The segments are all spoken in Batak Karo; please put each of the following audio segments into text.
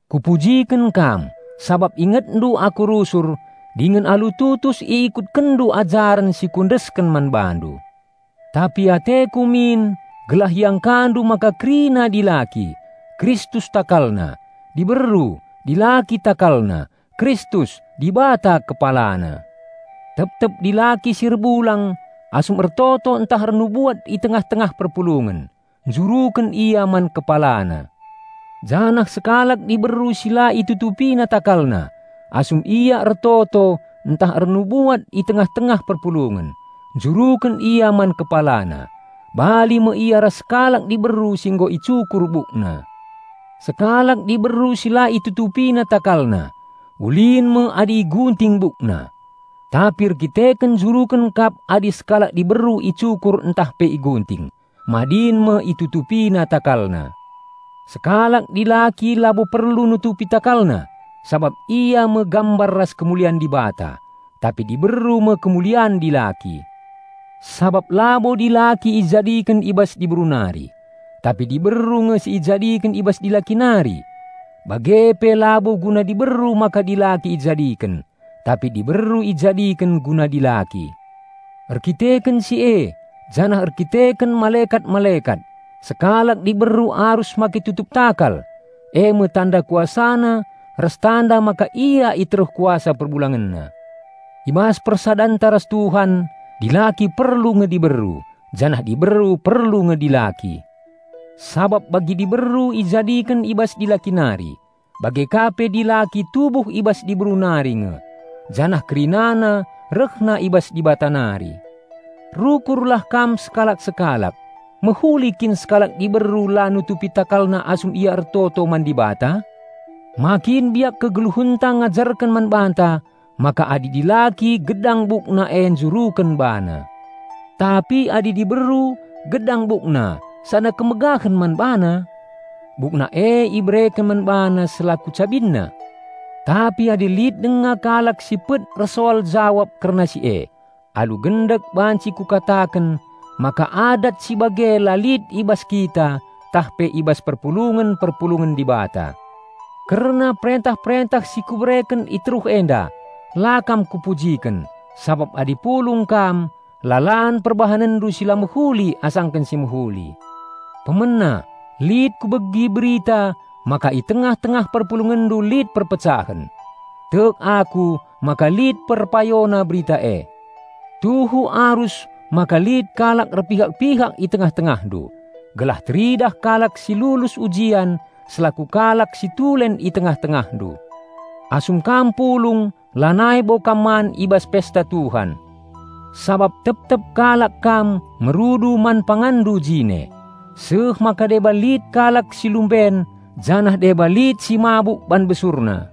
Kupujiken kam, sabap ingetndu aku rusur dingen alu tutus iikutkenndu ajaren si kuendesken man bandu. Tapi ateku min gelah iangkandu maka kerina dilaki, Kristus takalna; diberu, dilaki takalna; Kristus, Dibata kepalana. Tep-tep dilaki si erbulang asum ertoto ntah ernubuat i tengah-tengah perpulungen, njuruken ia man kepalana. Janah sekalak diberu si la itutupina takalna asum ia ertoto ntah ernubuat i tengah-tengah perpulungen, njuruken ia man kepalana; bali me ia ras sekalak diberu si nggo icukur bukna. Sekalak diberu si la itutupina takalna, ulin me adi igunting bukna. Tapi erdandanken njuruken kap adi sekalak diberu icukur ntah pe igunting, madin me itutupina takalna. Sekalak dilaki labo perlu nutupi takalna sabap ia me gambar ras kemulian Dibata. Tapi diberu me kemulian dilaki; sabap labo dilaki ijadiken i bas diberu nari, tapi diberu nge si ijadiken i bas dilaki nari. Bage pe labo guna diberu maka dilaki ijadiken, tapi diberu ijadiken guna dilaki. Erkiteken si e janah erkiteken malekat-malekat, sekalak diberu arus make tutup takal, eme tanda kuasana ras tanda maka ia i teruh kuasa perbulangenna. I bas persadanta ras Tuhan, dilaki perlu nge diberu, janah diberu perlu nge dilaki. Sabap bagi diberu ijadiken i bas dilaki nari, bage ka pe dilaki tubuh i bas diberu nari nge, janah kerinana rehna i bas Dibata nari. Rukurlah kam sekalak-sekalak: mehuli kin sekalak diberu la nutupi takalna asum ia ertoto man Dibata? Ma kin biak kegeluhenta ngajarken man banta maka adi dilaki gedang bukna e njuruken bana. Tapi adi diberu gedang bukna sada kemegahen man bana? Bukna e ibereken man bana selaku cabinna. Tapi adi lit denga kalak si pet ersoal jawab kerna si e, alu gendek banci kukataken maka adat si bage la lit i bas kita tah pe i bas perpulungen-perpulungen Dibata. Kerna perentah-perentah si kubereken i teruh enda la kam kupujiken, sabap adi pulung kam, lalan perbahanenndu si la mehuli asangken si mehuli. Pemena, lit kubegi berita maka i tengah-tengah perpulungenndu lit perpecahen. Tek aku maka lit perpayona berita e. Tuhu arus maka lit kalak erpihak-pihak i tengah-tengahndu, gelah teridah kalak si lulus ujian selaku kalak si tulen i tengah-tengahndu. Asum kam pulung lanai bo kam man i bas Pesta Tuhan. Sabap tep-tep kalak kam merudu man panganndu jine, seh maka deba lit kalak si lumben janah deba lit si mabuk ban besurna.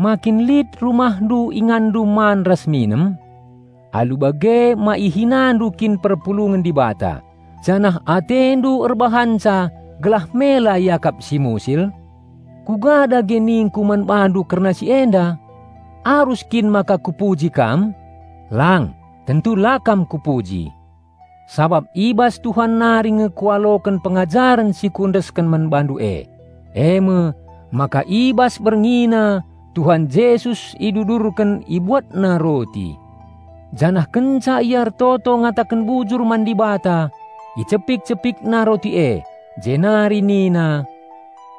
Ma kin lit rumahndu inganndu man ras minem? Alu bage ma ihinandu kin perpulungen Dibata, janah atendu erbahanca gelah mela iakap si musil? Kuga dage ningku man bandu kerna si enda? Arus kin maka kupuji kam? Lang, tentu la kam kupuji! Sabap i bas Tuhan nari nge kualoken pengajaren si kuendesken man bandu e, eme: maka i bas berngina Tuhan Jesus idudurken, IbuatNa roti. Janah kenca Ia ertoto ngataken bujur man Dibata, icepik-CepikNa roti e, jenari nina,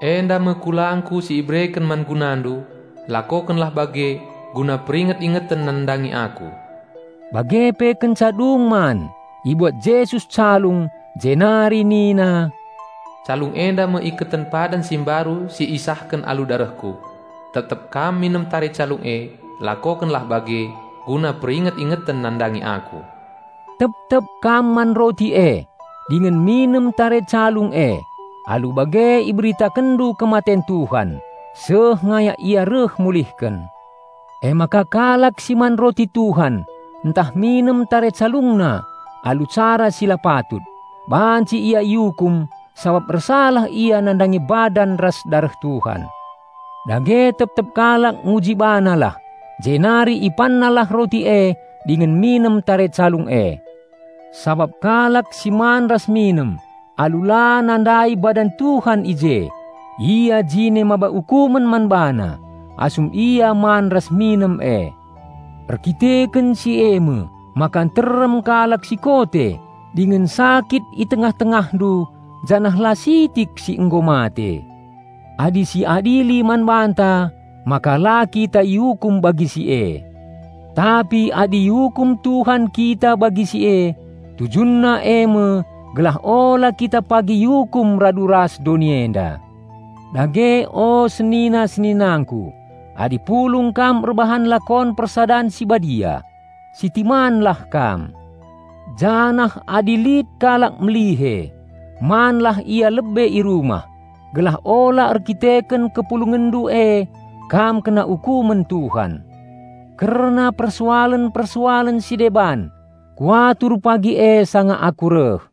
"Enda me kulangKu si ibereken man gunandu. Lakokenlah bage, guna peringet-ingeten nandangi Aku." Bage pe kenca dung man, ibuat Jesus calung, jenari nina, "Calung enda me iketen padan si mbaru si isahken alu darehKu. Tep-tep kam minem tare calung e, lakokenlah bage, guna peringet-ingeten nandangi Aku." Tep-tep kam man roti e, dingen minem tare calung e, alu bage iberitakenndu kematen Tuhan, seh ngayak Ia reh mulihken. Emaka kalak si man roti Tuhan ntah minem tare CalungNa alu cara si la patut, banci ia iukum sabap ersalah ia nandangi badan ras dareh Tuhan. Dage tep-tep kalak nguji banalah, jenari ipannalah roti e dingen minem tare calung e. Sabap kalak si man ras minem alu la nandai badan Tuhan i je, ia jine maba ukumen man bana, asum ia man ras minem e. Erdandanken si eme maka nterem kalak si kote dingen sakit i tengah-tengahndu janah la sitik si nggo mate. Adi si adili man banta, maka la kita iukum bagi si e. Tapi adi iukum Tuhan kita bagi si e, TujunNa eme gelah ula kita pagi iukum radu ras doni enda. Dage, o senina-seninangku, adi pulung kam erbahan Lakon Persadan si Badia, sitimanlah kam. Janah adi lit kalak melihe, manlah ia lebe i rumah, gelah ula erkiteken kepulungenndu e kam kena ukumen Tuhan. Kerna persoalen-persoalen si deban, kuatur pagi e sanga aku reh.